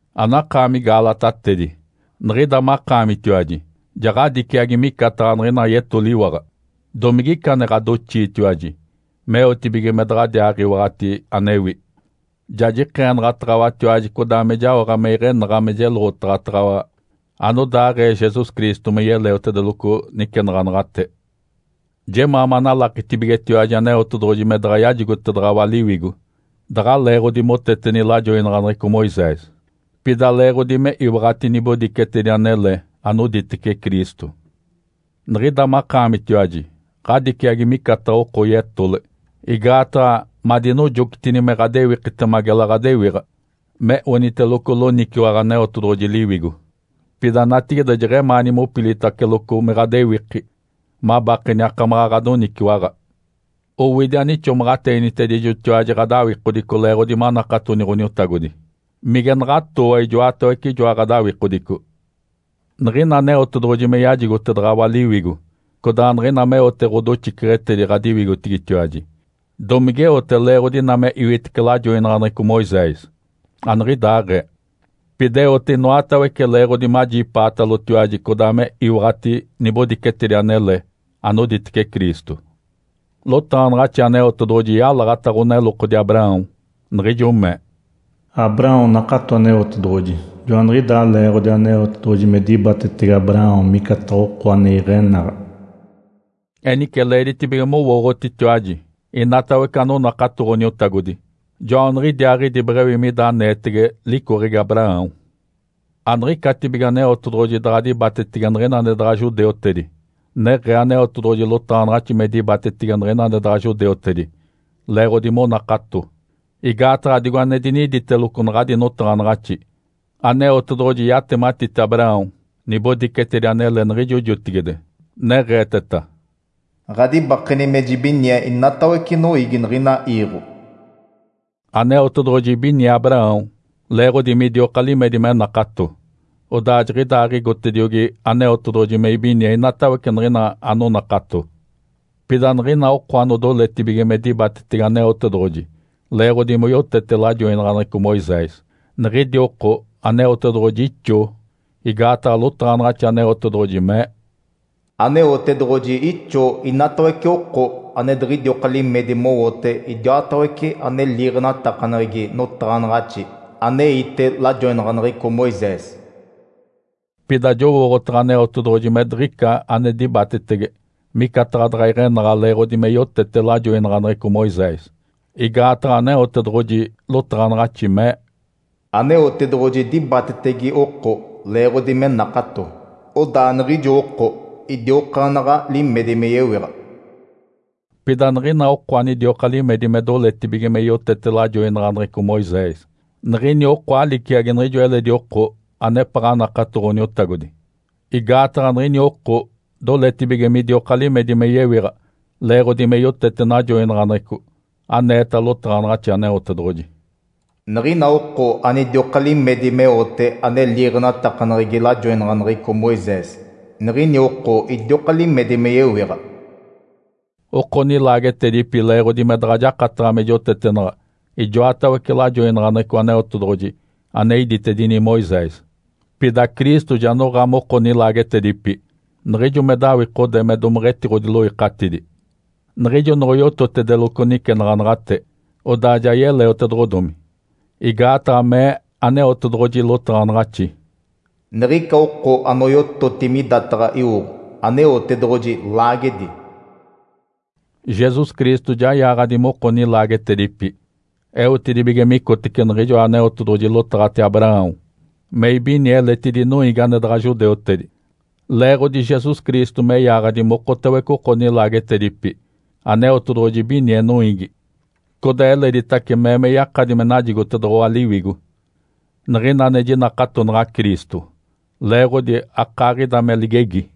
Anakaami Gaalatatedi. Niɡ̶ida makaamitiwaji ja ɡ̶adiciagi micataɡ̶a niɡ̶ina yetoliwaɡ̶a! Domigica ane ɡ̶adoxiitiwaji meotibige me daɡ̶adiaaɡ̶iwaɡ̶ati anewi? Ja jikeenaɡ̶ataɡ̶awatiwaji codaa me jaoɡ̶a me iɡ̶enaɡ̶a me jeloɡ̶otaɡ̶ataɡ̶awa anodaaɡ̶ee Jesus Cristo me yeleotedeloco nicenaɡ̶anaɡ̶ate. Jemaa manalakitibigetiwaji Aneotedoɡ̶oji me daɡ̶a yajigotedaɡ̶awa Liwigo daɡ̶a leeɡ̶odi moteteni lajoinaɡ̶aneɡ̶eco Moisés, pida leeɡ̶odi me iwaɡ̶ati nibodicetedi anele anoditece Cristo. Niɡ̶ida makaamitiwaji ɡ̶adiciagi micataɡ̶a oko yetole, igaataɡ̶a madinojocitini me ɡ̶adewikitema gela ɡ̶adewiɡ̶a me oniteloco loniciwaɡ̶a Aneotedoɡ̶oji Liwigo, pida natigide jeɡ̶emaani mopilitaceloco me ɡ̶adewiki, mabakeni akamaɡ̶a ɡ̶adoniciwaɡ̶a. Owidi anixomaɡ̶ateenitedijotiwaji ɡ̶adawikodico leeɡ̶odi manakatoni Ǥoniotagodi. Mige naɡ̶atooa ijoatawece ijoa ɡ̶adawikodico? Niɡ̶ina Aneotedoɡ̶oji me yajigotedaɡ̶awa Liwigo codaa niɡ̶ina meote ɡ̶odoxiceɡ̶etedi ɡ̶adiwigotigitiwaji, domigeote leeɡ̶odi ina me iwitece lajoinaɡ̶aneɡ̶eco Moisés? Aniɡ̶idaaɡ̶ee. Pida eote inoatawece leeɡ̶odi majipaatalotiwaji codaa me iwaɡ̶ati nibodicetedi anele anoditece Cristo. Lotaɡ̶anaɡ̶axi Aneotedoɡ̶oji yalaɡ̶ata ɡ̶onelokodi Abraão, niɡ̶ijo mee, “Abraão nakato Aneotedoɡ̶oji, joaniɡ̶idaa leeɡ̶odi Aneotedoɡ̶oji me dibatetege Abraão micataɡ̶a oko ane iɡ̶enaɡ̶a.” Enice leeditibige mowooɡ̶otitiwaji, inatawece anonakato Ǥoniotagodi, joaniɡ̶idiaaɡ̶idi beɡ̶ewi mida aneetege licoɡ̶egi Abraão. Aniɡ̶icatibige Aneotedoɡ̶oji daɡ̶a dibatetege niɡ̶ina ane daɡ̶a judeutedi, neɡ̶ee Aneotedoɡ̶oji lotaɡ̶anaɡ̶axi me dibatetege niɡ̶ina ane daɡ̶a judeutedi leeɡ̶odi monakato. Igaataɡ̶a digo ane diniditeloco naɡ̶adi notaɡ̶anaɡ̶axi, Aneotedoɡ̶oji yatematite Abraão nibodicetedi anele niɡ̶ijo jotigide, neɡ̶eeteta, “Ǥadibakeni me jibinie inatawece noiigi niɡ̶ina iiɡ̶o.” Aneotedoɡ̶oji ibinie Abraão leeɡ̶odi midioka limedi me nakato. Odaa jiɡ̶idaaɡ̶igotediogi Aneotedoɡ̶oji me ibinie inatawece niɡ̶ina anonakato. Pida niɡ̶ina oko anodoletibige me dibatetege Aneotedoɡ̶oji leeɡ̶odi moyotete lajoinaɡ̶aneɡ̶eco Moisés, niɡ̶idi oko Aneotedoɡ̶oji etacidetetece. Igaataɡ̶a lotaɡ̶anaɡ̶axi Aneotedoɡ̶oji mee, “Aneotedoɡ̶oji etacidetetece inatawece oko ane diɡ̶idioka limedi mowote idiwatawece ane liiɡ̶enatakaneɡ̶egi notaɡ̶anaɡ̶axi aneite lajoinaɡ̶aneɡ̶eco Moisés.” Pida jowooɡ̶otaɡ̶a Aneotedoɡ̶oji me diɡ̶ica ane dibatetege micataɡ̶a daɡ̶a iɡ̶enaɡ̶a leeɡ̶odi me yotete lajoinaɡ̶aneɡ̶eco Moisés. Igaataɡ̶a Aneotedoɡ̶oji lotaɡ̶anaɡ̶axi mee, “Aneotedoɡ̶oji dibatetege oko leeɡ̶odi me nakato, odaa niɡ̶ijo oko idiokaanaɡ̶a limedi me yewiɡ̶a.” Pida niɡ̶ina oko anidioka limedi me doletibige me yotete lajoinaɡ̶aneɡ̶eco Moisés, niɡ̶ini oko aliciagi niɡ̶ijo eledi oko anepaɡ̶a nakato Ǥoniotagodi. Igaataɡ̶a niɡ̶ini oko doletibige midioka limedi me yewiɡ̶a leeɡ̶odi me yotete najoinaɡ̶aneɡ̶eco, aneeta lotaɡ̶anaɡ̶axi Aneotedoɡ̶oji, “Niɡ̶ina oko anidioka limedi meote ane liiɡ̶enatakaneɡ̶egi lajoinaɡ̶aneɡ̶eco Moisés, niɡ̶ini oko idioka limedi me yewiɡ̶a.” Oko nilaagetedipi leeɡ̶odi me daɡ̶a jakataɡ̶a me jotetenaɡ̶a ijoatawece lajoinaɡ̶aneɡ̶eco Aneotedoɡ̶oji ane iditedini Moisés. Pida Cristo ja noɡ̶a moko nilaagetedipi niɡ̶ijo me dawikode me domeɡ̶etiɡ̶odiloikatidi, niɡ̶ijo noɡ̶oyototedeloco nicenaɡ̶anaɡ̶ate, odaa ja yeleotedoɡ̶odomi. Igaataɡ̶a mee Aneotedoɡ̶oji lotaɡ̶anaɡ̶axi, “Niɡ̶ica oko anoyototi midataɡ̶a iwoɡ̶o, Aneotedoɡ̶oji laagedi.” Jesus Cristo ja yaaɡ̶adi moko nilaagetedipi eotedibige micotece niɡ̶ijoa Aneotedoɡ̶oji lotaɡ̶ate Abraão me ibinie eletidi noiigi ane daɡ̶a judeutedi. Leeɡ̶odi Jesus Cristo me yaaɡ̶adi mokotawece oko nilaagetedipi, Aneotedoɡ̶oji ibinie noiigi, codaa eleditace mee me yakadi me najigotedoɡ̶owa Liwigo niɡ̶ina ane jinakatonaɡ̶a Cristo, leeɡ̶odi akaaɡ̶ida me ligegi.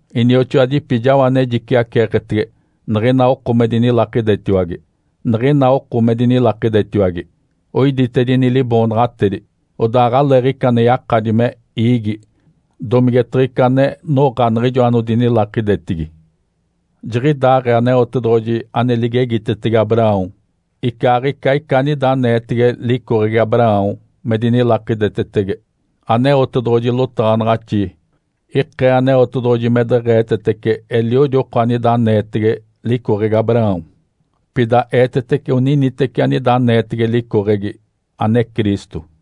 Inioxoadipi, jao ane jiciaceeketege niɡ̶ina oko me dinilakidetiwage. Niɡ̶ina oko me dinilakidetiwage, oiditedini liboonaɡ̶atedi, odaa aɡ̶aleeɡ̶ica ane yakadi me iigi domigetaɡ̶a ica ane noɡ̶a niɡ̶ijo anodinilakidetigi. Jiɡ̶idaaɡ̶ee Aneotedoɡ̶oji ane ligegitetege Abraão icaaɡ̶ica ica anida aneetege licoɡ̶egi Abraão me dinilakidetetege. Aneotedoɡ̶oji lotaɡ̶anaɡ̶axi ikee Aneotedoɡ̶oji me deɡ̶eetetece eliodi oko anida aneetege licoɡ̶egi Abraão, pida eetetece oniniteci anida aneetege licoɡ̶egi, ane Cristo.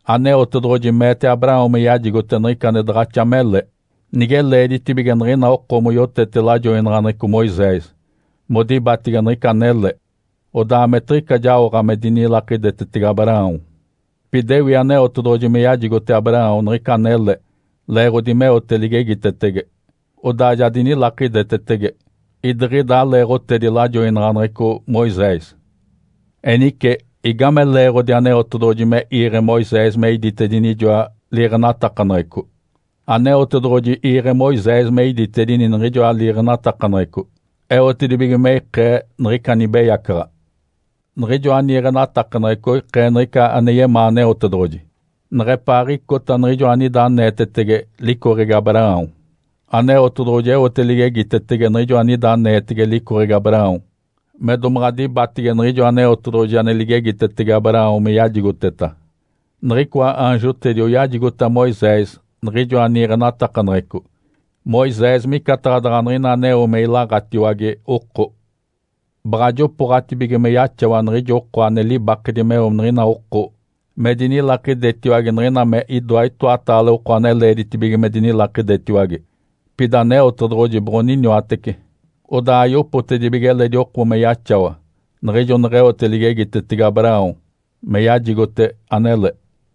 Aneotedoɡ̶oji meete Abraão me yajigote niɡ̶ica ane daɡ̶axa mele. Nige leeditibige niɡ̶ina oko moyotete lajoinaɡ̶aneɡ̶eco Moisés modibatege niɡ̶ica anele, odaa ametiɡ̶ica jaoɡ̶a me dinilakidetetege Abraão. Pida ewi Aneotedoɡ̶oji me yajigote Abraão niɡ̶ica anele leeɡ̶odi meote ligegitetege, odaa ja dinilakidetetege. Idiɡ̶ida aleeɡ̶otedi lajoinaɡ̶aneɡ̶eco Moisés. Enice, igame leeɡ̶odi Aneotedoɡ̶oji me iiɡ̶e Moisés me iditedini ijoa liiɡ̶enatakaneɡ̶eco? Aneotedoɡ̶oji iiɡ̶e Moisés me iditedini niɡ̶ijoa liiɡ̶enatakaneɡ̶eco eotedibige me ikee niɡ̶ica nibeyacaɡ̶a. Niɡ̶ijoa niiɡ̶enatakaneɡ̶eco oikee niɡ̶ica ane yemaa Aneotedoɡ̶oji, neɡ̶epaaɡ̶icota Niɡ̶ijoa anida aneetege licoɡ̶egi Abraão. Aneotedoɡ̶oji eote ligegitetege niɡ̶ijo anida aneetege licoɡ̶egi Abraão me domaɡ̶a dibatege niɡ̶ijo Aneotedoɡ̶oji ane ligegitetege Abraão me yajigoteta. Niɡ̶icoa aanjotedi oyajigota Moisés niɡ̶ijoa niiɡ̶enatakaneɡ̶eco, Moisés micataɡ̶a daɡ̶a niɡ̶ina aneo me ilaɡ̶atiwage oko. Baɡ̶a jopooɡ̶atibige me yaxawa niɡ̶ijo oko ane libakedi meo niɡ̶ina oko me dinilakidetiwage niɡ̶ina me idoa itoataale oko ane leeditibige me dinilakidetiwage. Pida Aneotedoɡ̶oji boɡ̶oniniwatece, odaa ayopotedibige eledi oko me yaxawa niɡ̶ijo neɡ̶eote ligegitetege Abraão me yajigote anele.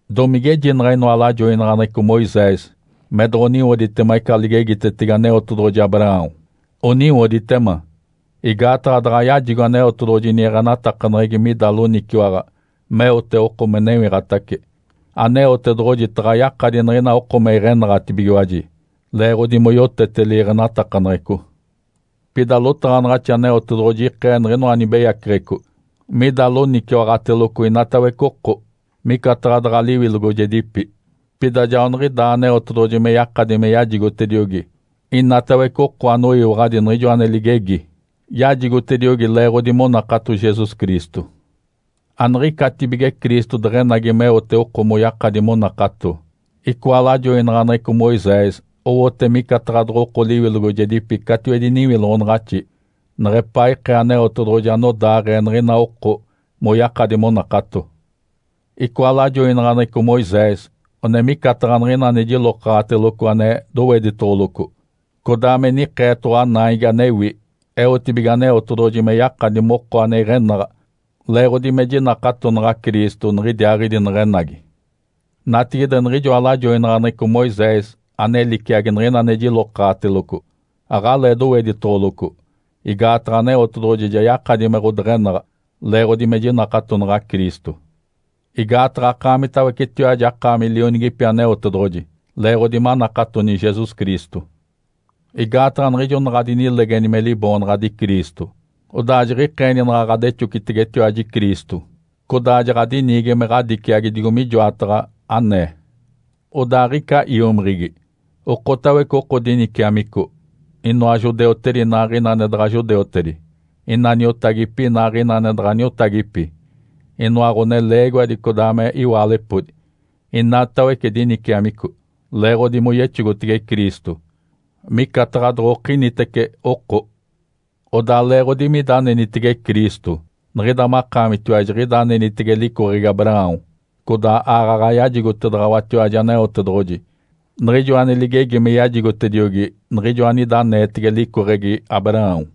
Domigejinaɡ̶a inoa lajoinaɡ̶aneɡ̶eco Moisés me doɡ̶oniwoditema ica ligegitetege Aneotedoɡ̶oji Abraão? Oniwoditema! Igaataɡ̶a daɡ̶a yajigo Aneotedoɡ̶oji niiɡ̶enatakaneɡ̶egi mida loniciwaɡ̶a meote oko me newiɡ̶atace, Aneotedoɡ̶oji taɡ̶a yakadi niɡ̶ina oko me iɡ̶enaɡ̶atibigiwaji leeɡ̶odi moyotete liiɡ̶enatakaneɡ̶eco. Pida lotaɡ̶anaɡ̶axi Aneotedoɡ̶oji ikee niɡ̶inoa nibeyaceɡ̶eco mida loniciwaɡ̶ateloco inatawece oko, micataɡ̶a daɡ̶a liwilogojedipi. Pida joaniɡ̶idaa Aneotedoɡ̶oji me yakadi me yajigotediogi inatawece oko anoyiwaɡ̶adi niɡ̶ijo ane ligegi yajigotediogi leeɡ̶odi monakato Jesus Cristo. Aniɡ̶icatibige Cristo deɡ̶enagi meote oko moyakadi monakato, icoa lajoinaɡ̶aneɡ̶eco Moisés owote micataɡ̶a doɡ̶oko liwilogojedipi catiwedi niwiloɡ̶onaɡ̶axi neɡ̶epaa ikee Aneotedoɡ̶oji anodaaɡ̶ee niɡ̶ina oko moyakadi monakato. Icoa lajoinaɡ̶aneɡ̶eco Moisés one micataɡ̶a niɡ̶ina ane jilokaɡ̶ateloco ane doweditoɡ̶oloco, codaa me nikeetoɡ̶owa naigi anewi eotibige Aneotedoɡ̶oji me yakadi moko ane iɡ̶enaɡ̶a leeɡ̶odi me jinakatonaɡ̶a Cristo niɡ̶idiaaɡ̶idi neɡ̶enagi. Natigide niɡ̶ijoa lajoinaɡ̶aneɡ̶eco Moisés ane liciagi niɡ̶ina ane jilokaɡ̶ateloco aɡ̶alee doweditoɡ̶oloco, igaataɡ̶a Aneotedoɡ̶oji ja yakadi me ɡ̶odeɡ̶enaɡ̶a leeɡ̶odi me jinakatonaɡ̶a Cristo. Igaataɡ̶a akaamitawecetiwaji akaami lionigipi Aneotedoɡ̶oji leeɡ̶odi manakatoni Jesus Cristo. Igaataɡ̶a niɡ̶ijo naɡ̶a adinilegeni me Liboonaɡ̶adi Cristo, odaa jiɡ̶ikeeni naɡ̶a ɡ̶adexocitegetiwaji Cristo, codaa jaɡ̶adiniigi me ɡ̶adiciagi digo mijoataɡ̶a anee. Odaa aɡ̶ica iomiɡ̶igi, okotawece oko diniciamico inoa judeutedi inaaɡ̶ina ane daɡ̶a judeutedi, ina niotagipi inaaɡ̶ina ane daɡ̶a niotagipi, inoa ɡ̶oneleegiwadi codaa me iwaalepodi, inatawece diniciamico leeɡ̶odi moyexogotege Cristo, micataɡ̶a doɡ̶okinitece oko. Odaa leeɡ̶odi mida anenitege Cristo, niɡ̶ida makaamitiwaji jiɡ̶ida anenitege licoɡ̶egi Abraão, codaa aaɡ̶aɡ̶a yajigotedaɡ̶awatiwaji Aneotedoɡ̶oji niɡ̶ijo ane ligegi me yajigotediogi niɡ̶ijo anida aneetege licoɡ̶egi Abraão.